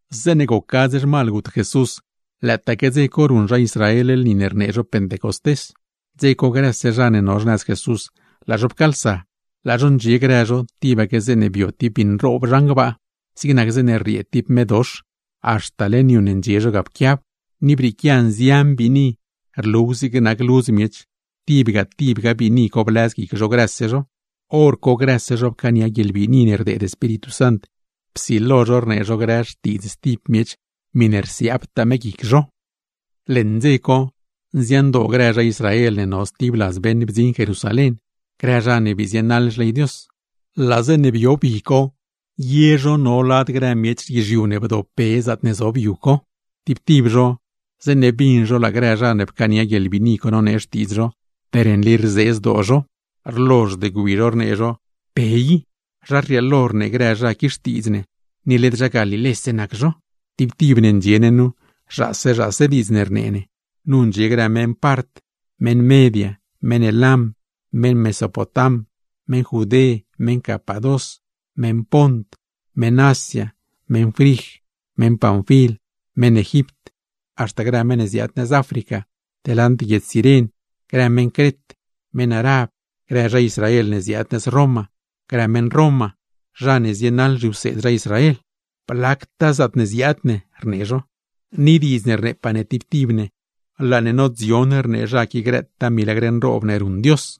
Zeeṉe goc gadz zhmal gut Jesús, lëëtaque dze co ruṉ grë zha Israel lni ne rnee zho Pentecostés. Dze co grëse zha ne no xnëz Jesús, laa zho pcaalsa. Laa zho ndxie grë zho, tibaque zeeṉe bio tib bi nroob zhan gbaa, zig nac zeeṉe rriee tib medox, haxta leṉ yu ne ndxie zho ga pquiab; ni brieequia nzian biini, rluw zig nac ludz miech, tibga tibga biini co blëz guic zho grëse zho. Horco grëse zho pcaania guieḻbiini ne bdeed Espíritu Sant, psilo zho rnee zho grë xtiidz stib miech miṉe rsiaabtaa me guic zho. Leṉ dze co nziandoo grë zha Israel ne no stib ladz beṉ bdziṉ Jerusalén, grë zha ne bii zienaḻ xley Dios. Laa zeeṉe bio bi co, ye zho no lad grë miech guizhiu ne bdopbe zaatne zob yu co; tib tib zho zeeṉe bin zho laa grë zha ne pcaania guieḻbiini co nonee xtiidz zho, per nli rzee zdoo zho. Rlozhd gwi zho rnee zho: ―¡Pe nli diidz rii! ¿Zha rrieelo rnee grë zha qui xtiidz ne, ni led zha Galilé nac zho? ¡Tib tib ne ndxie ne nu, zhaase zhaase diidz ne rnee ne! Nu ndxie grë meṉ Part, meṉ Media, meṉ Elam, meṉ Mesopotam, meṉ Judé, meṉ Capadós, meṉ Pont, meṉ Asia, meṉ Frij, meṉ Panfil, meṉ Egipt, haxta grë meṉ ne ziaad nëz África, delant guiedz Ciren; grë meṉ Cret, meṉ Arab, grë zha Israel ne ziaad nëz Roma, grë meṉ Roma, zha ne zienaḻ zhiwseed zha Israel. ’Pe zhidaa ne ―rnee zho―, ni diidz ne rneepaa ne tib tib ne laa ne nodzion rnee zha qui grëtaa milagr nroob ne ruṉ Dios.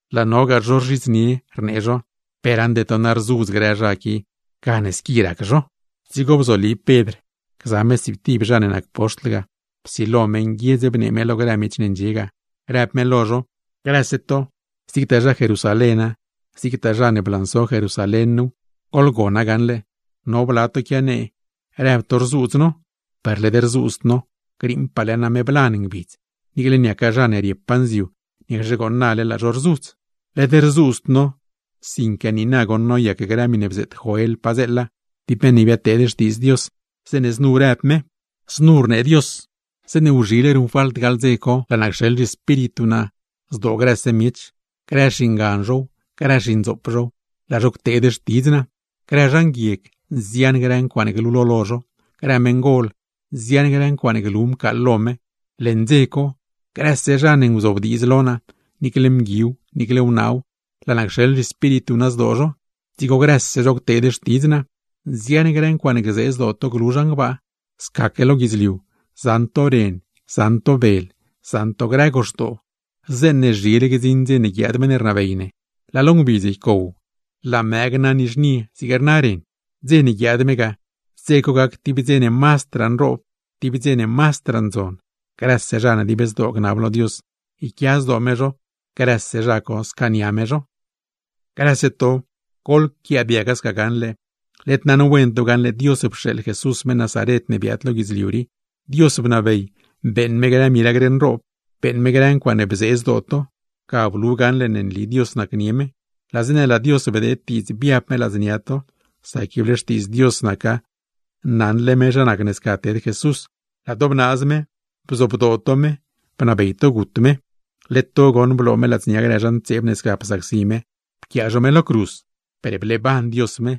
Laa nogaa zho rzhidznie, rnee zho: ―Rzudz grë zha qui, gane squi rzë xtiidz zho. Dzigo bzoli Pedr gza me stsiiptib zha ne nac poxtl ga, psilo me nguiedz bnee me lo grë miech ne ndxie ga, rëb me lo zho: ―Grëse to, zigtaa zha Jerusaléna, zigtagaa zha ne blanso Jerusalén nuw, goḻgona gaṉle. No bla to quianee rëb to rzuudz no, per led rzuudzd no. Griiṉpaale name blan ngbidz, niicle niaca zha ne riepaa nziu, niacxe gooṉ nale laa zho gzudz. Led rzuudzd no, sinque niina nagoṉ noyac grë miṉe bzeet Joel padzeela (tib meṉ ne biadteed xtiidz Dios), zeeṉe znu rëb me: Znu rnee Dios: Zeeṉe wzhile ruṉfalt gaḻ dze co, laa naa cxeḻ zhiEspíritu naa zdoo grëse miech; grë xingan zhow, grë xindzoop zhow, laa zho cteed xtidz naa, grë zha nguieg, nzian grë ncuaaṉe glulo lo zho, grë meṉgol, nzian grë ncuaaṉe glu mcaaḻ lo me. Leṉ dze co, grëse zha ne nguzobdiidz lo naa, niicle mguiw, niicle wnaaw laa naa cxeḻ zhiEspíritu naa zdoo zho, dzigo grëse zho cteed xtidz naa. Nzian grë ncuaaṉe gzee zdoo to glu naa zhan gbaa, scaque lo guidzliu, zaṉ to ren, zaṉ to bel, zaṉ to grë goxdoo. Zeeṉe zhile gdziṉ dze ne guiaad meṉ ne rnabey ne, laa lo ngbidz ycow, laa mëë gna nizhnie zig rna ren. Dze ne guiaad me ga, dze co gac tib dze ne mazdraa nroob, tib dze ne mazdraa ndzon. Grëse zha ne dib zdoo gnab lo Dios yquia zdoo me zho, grëse zha co scaania me zho. ’¡Grëse to, goḻquiaadiaga sca gaṉle! Led naṉwen to gaṉle Dios pxeeḻ Jesús, meṉ Nazaret ne biaad lo guidzliu rii, Dios bnabey beeṉ me grë milagr nroob, beeṉ me grë ncuaaṉe bzee zdoo to; ga blu gaṉle ne nli Dios nacnie me. Laa zeeṉe laa Dios bdeed diidz biab me ladznia to (sac ible xtiidzle Dios naca, naṉle me zha nac ne sca ted Jesús), laa to bnaaz me, bzobdoo to me, bnabey to gut me. Led to goṉ bloo me ladznia grë zha ntseeb ne sca psacsi me pquiaa zho me lo cruz. Per bleeban Dios me,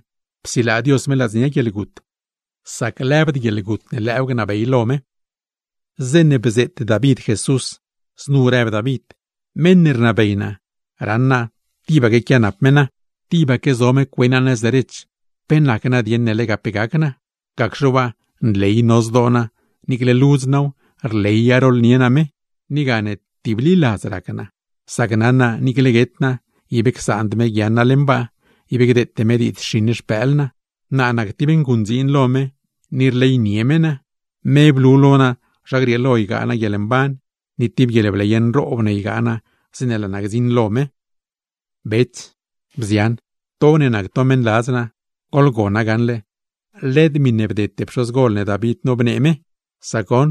psilaa Dios me ladznia guieḻgut; sac lëbd guieḻgut ne lëëw gnabey lo me. ’Zeeṉe bzeet David Jesús, znu rëb me: Meṉ ne rnabey naa, raṉ naa tibaque quianap me naa; tibaque zo me cue naa nëz derech, ¿pe nac nadieṉ ne lega pe gac naa? Gacxe waa, nley no zdoo naa, niicle ludz naaw, rleya rooḻnie naa me. Ni gane tibliladz rac naa; sac naṉ naa niicle guet naa, ib csaand me guiaaṉ naa leṉ baa, ib gdeete me diidz xiṉ xpëël naa. Naa nac tib nguṉdziin lo me, ni rleynie me naa. Me blu lo naa zha grieelo ygaa naa guieḻmban, ni tib guieḻbley nroob ne ygaa naa zeeṉe laa naa gdziṉ lo me. ’Bets, bzian, to ne nac to meṉladz naa, goḻgona gaṉle: led miṉe bdete pxozgol ne David bnee me nu; sac goṉ,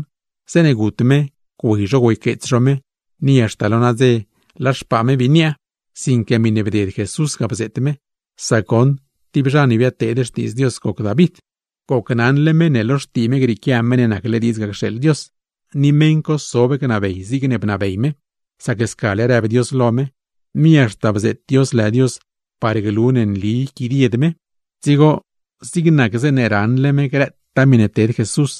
zeeṉe gut me güey zho güeyqueets zho me, ni haxta lo nadze laa xpaa me bii niaa. Sinque miṉe bded Jesús ga bzeet me, sac goṉ tib zha ne biadteed xtiidz Dios goc me. Gocnaṉle me ne lo xtii me grieequia Meṉ ne nacle diidz ga cxeeḻ Dios, ni meṉ co sob gnabey zigne bnabey me; sac scale rëb Dios lo me, ni haxta bzeet Dios lë Dios parne glu ne yquidied me. Dzigo zig nac zeeṉe raṉle me grëtaa miṉe ted Jesús,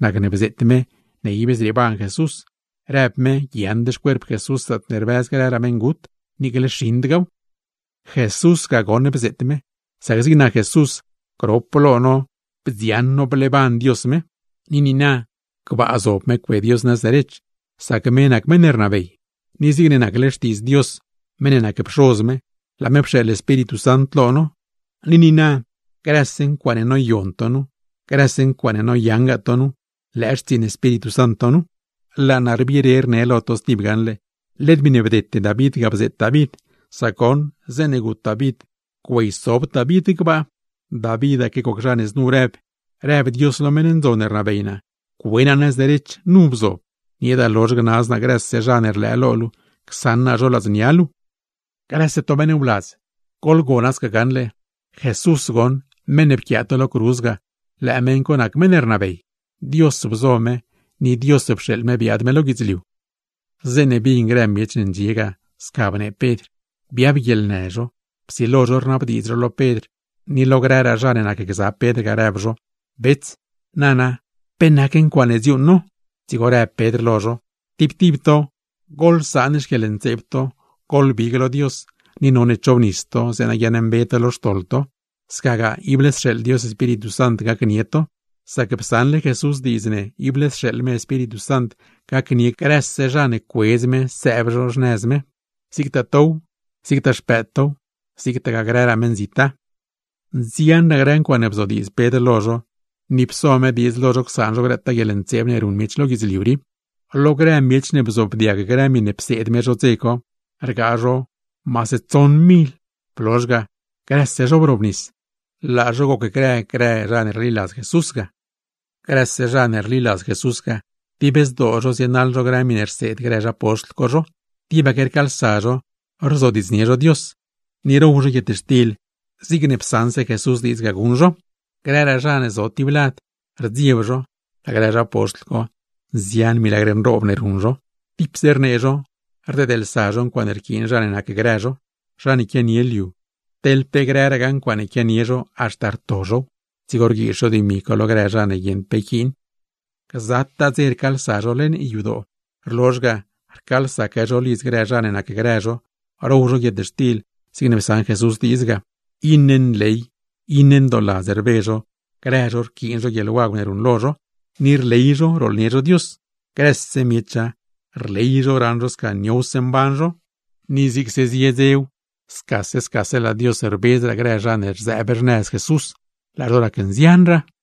nacne bzeet me ne ib zrieeban Jesús, rëb me guiaaṉd xcuerp Jesús zaatne rbëz grëraa meṉgut, niicle xiṉdgaaw. ’Jesús ga goṉ bzeet me, sac zig nac Jesús grop lo no bdioṉ no bleeban Dios me, ni niina gbaa zob me cue Dios nëz derech, sac me nac meṉ rnabey. Ni zigne nacle xtiidz Dios meṉ ne nac Pxoz me, laa me pxeeḻ Espíritu Sant lo no; ni niina grëse ncuaaṉe noyaṉ tow, grëse ncuaaṉe noyongaa tow, xtsiiṉ Espíritu Santow. Laa naa rbire rne lo to stib gaṉle, led miṉe bdete David ga bzeet David; sac goṉ, zeeṉe gut David güeysobd David gbaa. Davitaque goc zha ne znu rëb: Rëb Dios lo meṉ ndzon ne rnabey naa: “Cue naa nëz derech, nu bzob, nieeda lozh gnaz naa grëse zha ne rlëë lo luu, csaṉ naa zho ladznia luu.” ’Grëse to meṉ wladz, goḻgona sca gaṉle: Jesús goṉ, meṉ ne pquiaa to lo cruz ga, lëë meṉ co nac meṉ ne rnabey. Dios bzo me, ni Dios pxeeḻ me biaad me lo guidzliu. Zeeṉe bin grë miech ne ndxie ga sca bnee Pedr, biab guieḻnë zho, psilo zho rnabdiidz zho lo Pedr ni lo grëraa zha ne nacgza Pedr ga, rëb zho: ―Bets, nana, ¿pe nac ncuaaṉe dziuuṉ no? Dzigo rëb Pedr lo zho: ―Tib tib to, goḻsaan xquieḻntseeb to, goḻbig lo Dios, ni none chobnis to zeeṉa guiaaṉmbe to lo xtoḻ to; scagaa ible sxeeḻ Dios Espíritu Sant gacnie to. Sac psaṉle Jesús diidz ne ible sxeeḻ me Espíritu Sant gacnie grëse zha ne cuedz me sëëb xnëz me; zigtaa tow, zigtaa xpëëd tow, zigtagaa grëraa meṉzita. Nzianraa grë ncuaaṉe bzodiidz Pedr lo zho, ni pso me diidz lo zho csaan zho grëtaa guieḻntseeb ne ruṉ miech lo guidzliu rii. Lo grë zha ne bzoobdiag grë miṉe pseed me zho dze co, rgaa zho maase tsoṉ mil; blozh ga, grëse zho brobnis, laa zho gocgrë grë zha ne rliladzle Jesús ga. Grëse zha ne rliladz Jesús ga, dib zdoo zho zienaḻ zho grë miṉe rseed grë zha poxtl co zho, tibaque rcaalsa zho rzodiidznie zho Dios, ni row zho guietxtil zigne psaṉse Jesús diidz guṉ zho. Grëraa zha ne zo stib lad, rdzieb zho; laa grë zha poxtl co, nzian grë milagr nroob ne ruṉ zho. Tipse rnee zho, rdeedlsa zho ncuaaṉe rquiin zha ne nacgrë zho; zha ne quianie liu, teḻ pe grëragaa ncuaaṉe quianie zho, haxta rto zhow, dzigo rguiiz zho dimi co lo grë zha ne guieṉd pe yquiin. Gzataa dze rcaalsa zho leṉ yadoo; rlozh ga, rcaalsaque zho lidz grë zha ne nacgrë zho row zho guietxtil zigne psaṉ Jesús diidz ga; iṉe nley, iṉe ndooladz rbe zho grë zho rquiin zho guieḻwagw ne ruṉlo zho, ni rley zho rooḻnie zho Dios. Grëse miecha, rley zho raṉ zho sca niowse mban zho; ni zigse zie dzew, scase scase laa Dios rbedzraa grë zha ne rzëëb xnëz Jesús, laa zho racnzianraa.